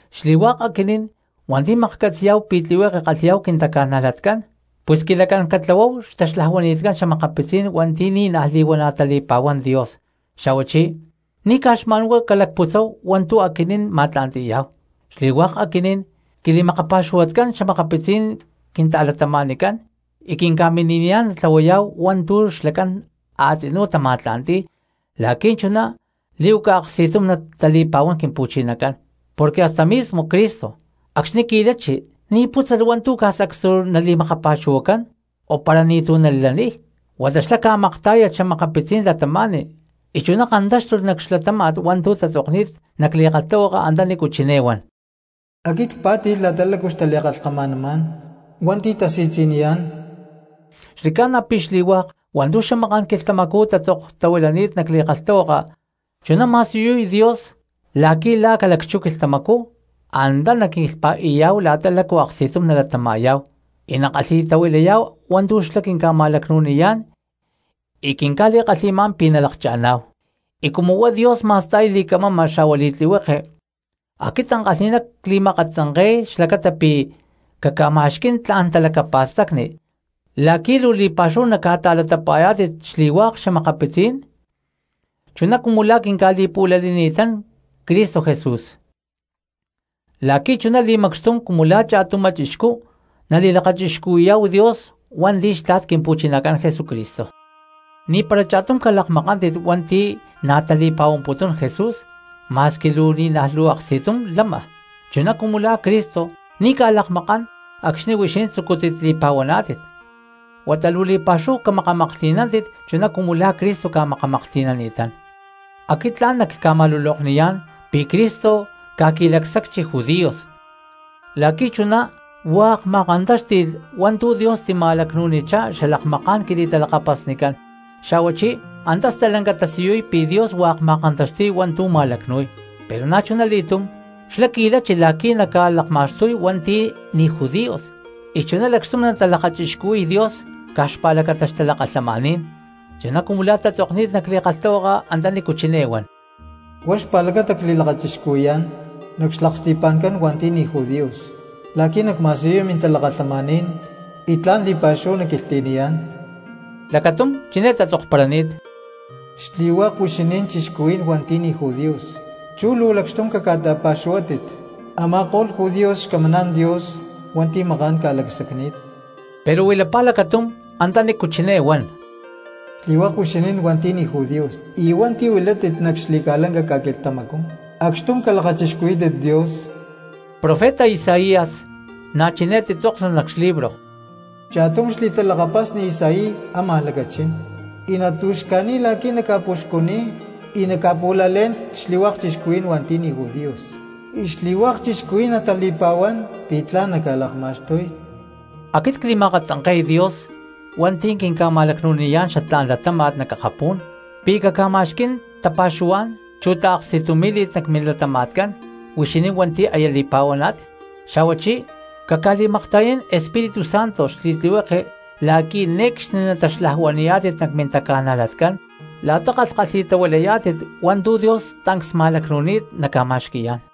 Xli̠hua̠k aquinín hua̠nti̠ maklhcatzi̠yá̠hu pi̠ tlihueke kalhi̠yá̠hu quintaca̠najlatcán, pus quilacán catlahuáhu xtaxlajuanitcán xa̠makapitzí̠n hua̠nti̠ ni̠naj li̠huana̠ tali̠pa̠huán Dios, xa̠huachí ni̠ caj xma̠nhuá calacputzáhu hua̠ntu̠ aquinín ma̠tla̠nti̠yá̠hu. Xli̠hua̠k aquinín quili̠makapa̠xuhuatcán xa̠makapitzí̠n quinta̠cristianoscán y quinca̠mini̠niyá̠n natlahuayá̠hu hua̠ntu̠ xlacán a̠tzinú tama̠tla̠nti̠y la̠qui̠ chuná li̠huaca aksti̠tum natali̠pa̠huán Quimpu̠chinacán. Porque hasta mismo Cristo acxni̠ qui̠lachi ni̠ pútzalh hua̠ntu̠ caj sacstu nali̠makapa̠xuhuacán o para ni̠tu̠ nalaniy, huata xlá ca̠maktá̠yalh cristianos y chuná kantáxtulh nac xlatáma̠t hua̠ntu̠ tatzokni̠t nac li̠kalhtahuaka antanícu chiné huan: “Aquit cpá̠ti̠lh la̠ta lácu xtali̠kalhkama̠namá̠n hua̠nti̠ tasi̠tzi̠niyá̠n.” Xli̠ca̠na pi̠ xli̠hua̠k hua̠ntu̠ xamaká̠n quilhtamacú tatzoktahuilani̠t nac li̠kalhtahuaka chuná ma̠siyuni̠t Dios la̠qui̠ la̠ ca̠lacchú quilhtamacú antá naquilhpa̠i̠yá̠hu la̠ta lácu aksti̠tum nalatama̠yá̠hu y nakalhi̠tahuilayá̠hu hua̠ntu̠ xlá quinca̠ma̠lacnu̠niyá̠n y quinca̠li̠kalhi̠má̠n pi̠ nalakcha̠ná̠hu. Y cumu huá Dios ma̠sta̠y li̠camama xa̠hua li̠tlihueke aquit ankalhi̠ná cli̠ma̠katzanke̠y xlacata pi̠ caca̠ma̠xquí̠n tla̠n talacapa̠stacni la̠qui̠ luu li̠pa̠xúhu naca̠ta̠latapa̠yá̠tit xli̠hua̠k cristianos chuná cumu la̠ quinca̠li̠pu̠lanini̠tán Cristo Jesús, la̠qui̠ chuná li̠macxtum cumu la̠ cha̠tumá chixcú nalakachixcuhui̠yá̠hu Dios hua̠nti̠ xtla̠t Quimpu̠chinacán Jesucristo. Ni̠para cha̠tum cristiano calakmakántit hua̠nti̠ na̠ tali̠pa̠huamputún Jesús ma̠squi ni̠naj luu aksti̠tum lama, chuná cumu la̠ Cristo ni̠ ca̠lakmakán acxni̠ huixinín tzucútit li̠pa̠huaná̠tit, huata luu li̠pa̠xúhu camakamaklhti̠nántit chuná cumu la̠ Cristo ca̠makamaklhti̠nani̠tán. Aquit tla̠n nacca̠ma̠lulokniyá̠n pi̠ Cristo ca̠qui̠li̠scujchi judíos la̠qui̠ chuná hua̠k ma̠kantáxti̠lh hua̠ntu̠ Dios tica̠ma̠lacnu̠nichá xalakmaká̠n quili̠talakapasnicán, xa̠huachí antá stalanca tasiyuy pi̠ Dios hua̠k ma̠kantaxti̠y hua̠ntu̠ ma̠lacnu̠y. Pero na̠chuna li̠túm xlá qui̠lachi la̠qui̠ naca̠lakma̠xtuy hua̠nti̠ ni̠ judíos y chuná lacxtum natalakachixcuhui̠y Dios caj xpa̠lacata xtalakalhamaní̠n, chuná cumu la̠ tatzokni̠t nac li̠kalhtahuaka antanícu chiné huan: Huá xpa̠lacata cli̠lakachixcuhui̠yá̠n nac xlaksti̠pa̠ncán hua̠nti̠ ni̠ judíos la̠qui̠ nacma̠siyuy mintalakalhamaní̠n, y tla̠n li̠pa̠xúhu nacquilhtli̠niyá̠n. Lacatum chiné tatzokparani̠t: Xli̠hua̠k huixinín cristianos hua̠nti̠ ni̠ judíos chú luu lacxtum caca̠ta̠pa̠xuhuátit a̠ma̠ko̠lh judíos xcamaná̠n Dios hua̠nti̠ maká̠n ca̠lacsacni̠t. Pero huilapá lacatum antanícu chiné huan: Xli̠hua̠k huixinín hua̠nti̠ ni̠ judíos y hua̠nti̠ huilátit nac xli̠ca̠lanca ca̠quilhtamacú, acxtum calakachixcuhuí̠tit Dios. Profeta Isaías na̠ chiné titzóknulh nac xlibro: Cha̠tum xli̠talakapasni Isaí ámaj lacachín y natu̠xca̠ni̠y la̠qui̠ naca̠puxcuniy y naca̠pu̠lalé̠n xli̠hua̠k cristianos hua̠nti̠ ni̠ judíos, y xli̠hua̠k cristianos natali̠pa̠huán pi̠ tla̠n naca̠lakma̠xtuy. Aquit cli̠ma̠katzanke̠y Dios hua̠nti̠ quinca̠ma̠lacnu̠niyá̠n xatlá̠n latáma̠t nac akapú̠n, pi̠ caca̠ma̠xquí̠n tapa̠xuhuá̠n chu taaksti̠tumí̠li̠t nac milatama̠tcán huixinín hua̠nti̠ aya li̠pa̠huaná̠tit, xa̠huachí caca̠li̠makta̠yán Espíritu Santo xli̠tlihueke la̠qui̠ ne̠cxni nataxlajuani̠yá̠tit nac mintaca̠najlatcán la̠ta kalhkalhi̠tahuilayá̠tit hua̠ntu̠ Dios tancs ma̠lacnu̠ni̠t naca̠ma̠xqui̠yá̠n.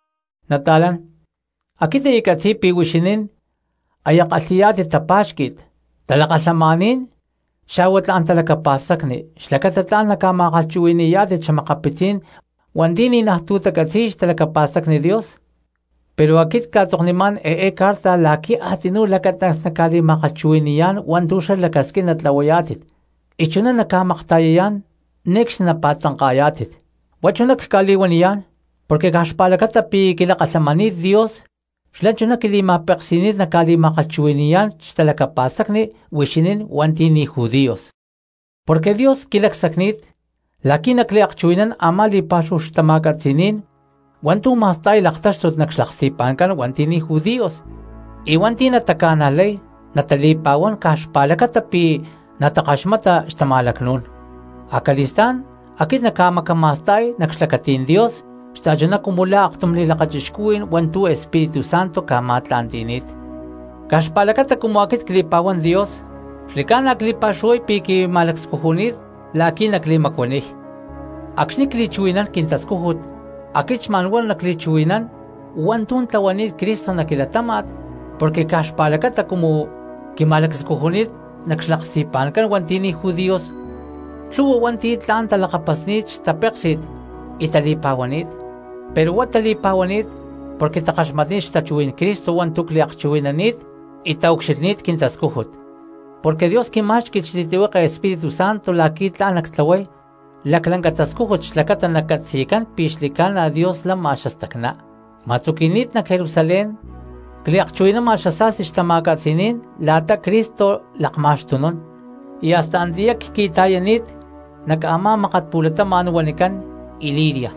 Nata̠lán, aquit ccatzi̠y pi̠ huixinín áya kalhi̠yá̠tit tapa̠xqui̠t, talakalhamaní̠n xa̠hua tla̠n talacapa̠stacni xlacata tla̠n naca̠ma̠kalhchuhui̠ni̠yá̠tit xa̠makapitzí̠n hua̠nti̠ ni̠najtú tacatzi̠y xtalacapa̠stacni Dios, pero aquit cca̠tzoknimá̠n eé carta la̠qui̠ a̠tzinú lacatancs nacca̠li̠ma̠kalhchuhui̠ni̠yá̠n hua̠ntu̠ xlá lacasquín natlahuayá̠tit, y chuná naca̠makta̠yayá̠n ne̠cxni napa̠tzanka̠yá̠tit. Huá chuná cca̠li̠huaniyá̠n porque caj xpa̠lacata pi̠ quilakalhamani̠t Dios xlá chuná quili̠ma̠peksi̠ni̠t nacca̠li̠ma̠kalhchuhui̠ni̠yá̠n xtalacapa̠stacni huixinín hua̠nti̠ ni̠ judíos. Porque Dios quilacsacni̠t la̠qui̠ nacliakchuhui̠nán amá li̠pa̠xúhu xtama̠catzi̠ní̠n hua̠ntu̠ ma̠sta̠y laktáxtut nac xlaksti̠pa̠ncán hua̠nti̠ ni̠ judíos, y hua̠nti̠ nataca̠najlay natali̠pa̠huán caj xpa̠lacata pi̠ natakaxmata xtama̠lacnú̠n, acali̠stá̠n aquit nacca̠macama̠sta̠y nac xlacatí̠n Dios xta̠chuná cumu la̠ aktum li̠lakachixcuhuí̠n hua̠ntu̠ Espíritu Santo ca̠ma̠tla̠nti̠ni̠t. Caj xpa̠lacata cumu aquit cli̠pa̠huán Dios xli̠ca̠na pi̠ luu cli̠pa̠xuhuay pi̠ tla̠n quima̠lacscujuni̠t la̠qui̠ nacli̠macuaniy. Acxni̠ cli̠chuhui̠nán quintascújut aquit xma̠n huá nacli̠chuhui̠nán hua̠ntu̠ tlahuani̠t Cristo nac quilatáma̠t porque caj xpa̠lacata cumu quima̠lacscujuni̠t nac xlaksti̠pa̠ncán hua̠nti̠ ni̠ judíos lhu̠hua hua̠nti̠ tla̠n talakapasni̠t xtapéksi̠t y tali̠pa̠huani̠t. Pero huá tali̠pa̠huani̠t porque takaxmatni̠t xtachuhuí̠n Cristo hua̠ntu̠ cliakchuhui̠nani̠t y taucxilhní̠t quintascújut, porque Dios quimá̠xqui̠lh xli̠tlihueke Espíritu Santo la̠qui̠ tla̠n nactlahuay laclanca tascújut xlacata nacatzi̠cán pi̠ xli̠ca̠na Dios lama xastacná. Cma̠tzuqui̠ni̠t nac Jerusalén la̠ta cliakchuhui̠nama xasa̠sti xtama̠catzi̠ní̠n la̠ta Cristo lakma̠xtunún, y hasta antiyá cqui̠ta̠yani̠t nac a̠má mákat pu̠latama̠n huanicán Iliria.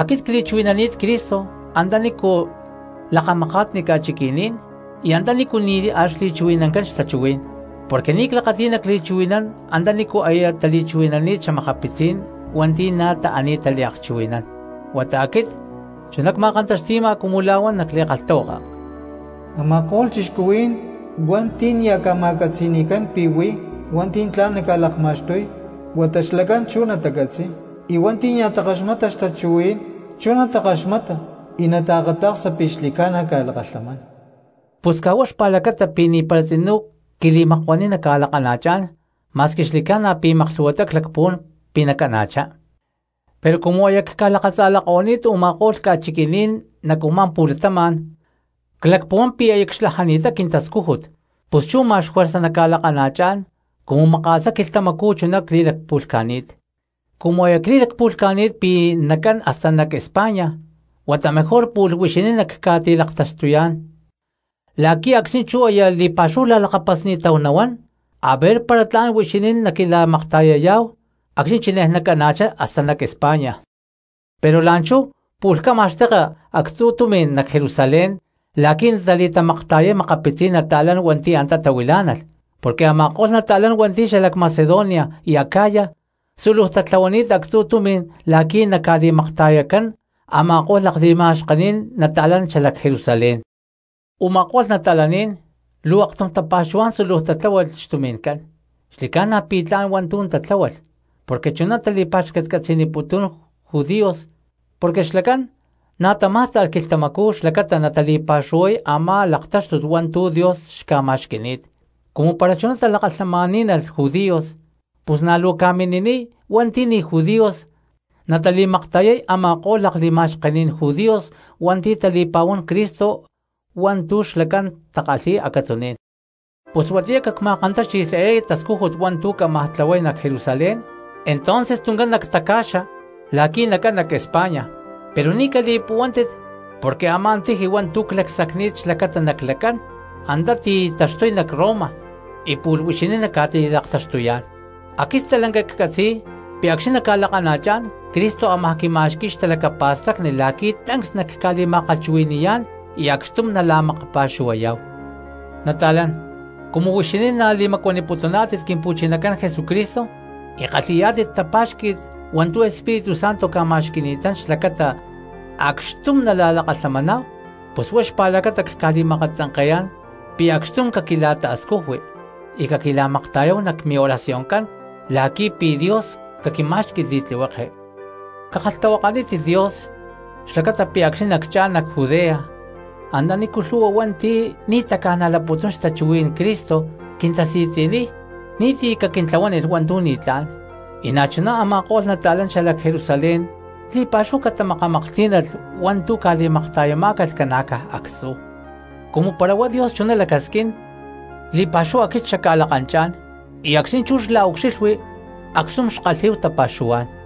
Aquit antá cli̠chuhui̠nani̠t Cristo antanícu lakamakatni ca̠chiqui̠ní̠n y antanícu nia̠ xli̠chuhui̠nancán xtachuhuí̠n, porque ni̠ clakati̠y nacli̠chuhui̠nán antanícu aya tali̠chuhui̠nani̠t xa̠makapitzí̠n hua̠nti̠ na̠ taani̠t tali̠akchuhui̠nán. Huata aquit chuná cma̠kantaxti̠ma cumu la̠ huán nac li̠kalhtahuaka: Ama̠ko̠lh cristianos hua̠nti̠ nia̠ ca̠ma̠catzi̠ni̠cán pi̠ huí hua̠nti̠ tla̠n naca̠lakma̠xtuy, huata xlacán chú natacatzi̠y, y hua̠nti̠ nia̠ takaxmata xtachuhuí̠n chú natakaxmata y nataakata̠ksa pi̠ xli̠ca̠na ca̠lakalhamán. Pus caj huá xpa̠lacata pi̠ ni̠para tzinú quili̠makuaniy nacca̠lakana̠chá̠n, ma̠squi xli̠ca̠na pi̠ maklhu̠huatá clacpuhuán pi̠ nacana̠chá. Pero cumu aya cca̠lakatza̠lako̠ni̠t u̠ma̠ko̠lh ca̠chiqui̠ní̠n nac u̠má pu̠latama̠n, clacpuhuán pi̠ aya cxlajani̠t quintascújut pus chú ma̠x juerza nacca̠lakana̠chá̠n cumu maka̠sá quilhtamacú chuná cli̠lacpu̠lhca̠ni̠t. Cumu aya cli̠lacpu̠lhca̠ni̠t pi̠ nacán hasta nac España, huata mejor pu̠lh huixinín nacca̠ti̠laktaxtuyá̠n la̠qui̠ acxni̠ chú aya li̠pa̠xúhu la̠lakapasni̠táhu nahuán aver para tla̠n huixinín naquila̠makta̠yayá̠hu acxni̠ chinej nacana̠chá hasta nac España. Pero la̠nchú pu̠lh cámaj xteka actzu̠ tumi̠n nac Jerusalén la̠qui̠ natali̠tamakta̠yay makapitzí̠n nata̠lán hua̠nti̠ antá tahuilá̠nalh. Porque a̠ma̠ko̠lh nata̠lán hua̠nti̠ xalac Macedonia y Acaya súluj tatláhualh actzu̠ tumi̠n la̠qui̠ naca̠li̠makta̠yacán a̠ma̠ko̠lh lakli̠ma̠xkení̠n nata̠lán xalac Jerusalén. Uma̠kó̠lh cristianos luu aktum tapa̠xuhuá̠n súluj tatláhualh xtumi̠ncán, xli̠ca̠na pi̠ tla̠n hua̠ntu̠ tatláhualh porque chuná tali̠pa̠xcatcatzi̠niputún judíos porque xlacán na̠ tamá̠sta̠lh quilhtamacú xlacata natali̠pa̠xuhuay a̠má laktáxtut hua̠ntu̠ Dios xca̠ma̠xqui̠ni̠t. Cumu para chuná talakalhamaní̠nalh judíos pus na̠ luu ca̠mini̠niy hua̠nti̠ ni̠ judíos natali̠makta̠yay a̠ma̠ko̠lh lakli̠ma̠xkení̠n judíos hua̠nti̠ tali̠pa̠huán Cristo hua̠ntu̠ xlacán takalhi̠y acatzuní̠n. Pus huatiyá cacma̠kantáxti̠lh eé tascújut hua̠ntu̠ cámaj tlahuay nac Jerusalén, entonces tuncán nactaca̠xa la̠qui̠ nacán nac España, pero ni̠ cali̠puhuántit porque a̠má tiji hua̠ntu̠ clacsacni̠t xlacata naclacán, antá ti̠taxtuy nac Roma y pu̠lh huixinín nacca̠ti̠laktaxtuyá̠n. Aquit stalanca ccatzi̠y pi̠ acxni̠ nacca̠lakana̠chá̠n Cristo ámaj quima̠xqui̠y xtalacapa̠stacni la̠qui̠ tancs nacca̠ma̠kalhchuhui̠ni̠yá̠n y acxtum nala̠makapa̠xuhuayá̠hu. Nata̠lán, cumu huixinín na̠ li̠macuaniputuná̠tit Quimpu̠chinacán Jesucristo y kalhi̠yá̠tit tapa̠xquí̠tit hua̠ntu̠ Espíritu Santo ca̠ma̠xqui̠ni̠tán xlacata acxtum nala̠lakalhamaná̠hu, pus huá xpa̠lacata cca̠li̠ma̠akatzanke̠yá̠n pi̠ acxtum caquila̠ta̠scujui y caquila̠makta̠yáhu nac mioracioncán la̠qui̠ pi̠ Dios caquimá̠xqui̠lh li̠tlihueke. Cakalhtahuakanítit Dios xlacata pi̠ acxni̠ naccha̠n nac Judea antanícu lhu̠hua cristianos hua̠nti̠ ni̠ tacanajlaputún xtachuhuí̠n Cristo quintasi̠tzi̠niy, ni̠ti̠ caquintlahuánilh hua̠ntu̠ ni̠tlá̠n; y na̠chuná a̠ma̠ko̠lh nata̠lán xalac Jerusalén li̠pa̠xúhu catamakamaklhtí̠nalh hua̠ntu̠ ca̠li̠makta̠yamá̠calh ca̠na̠caj actzú. Cumu para huá Dios chuná lacasquín li̠pa̠xúhu aquit xacca̠lakanchá̠n y acxni̠ chú xla̠ucxilhui acxtum xkalhí̠hu tapa̠xuhuá̠n.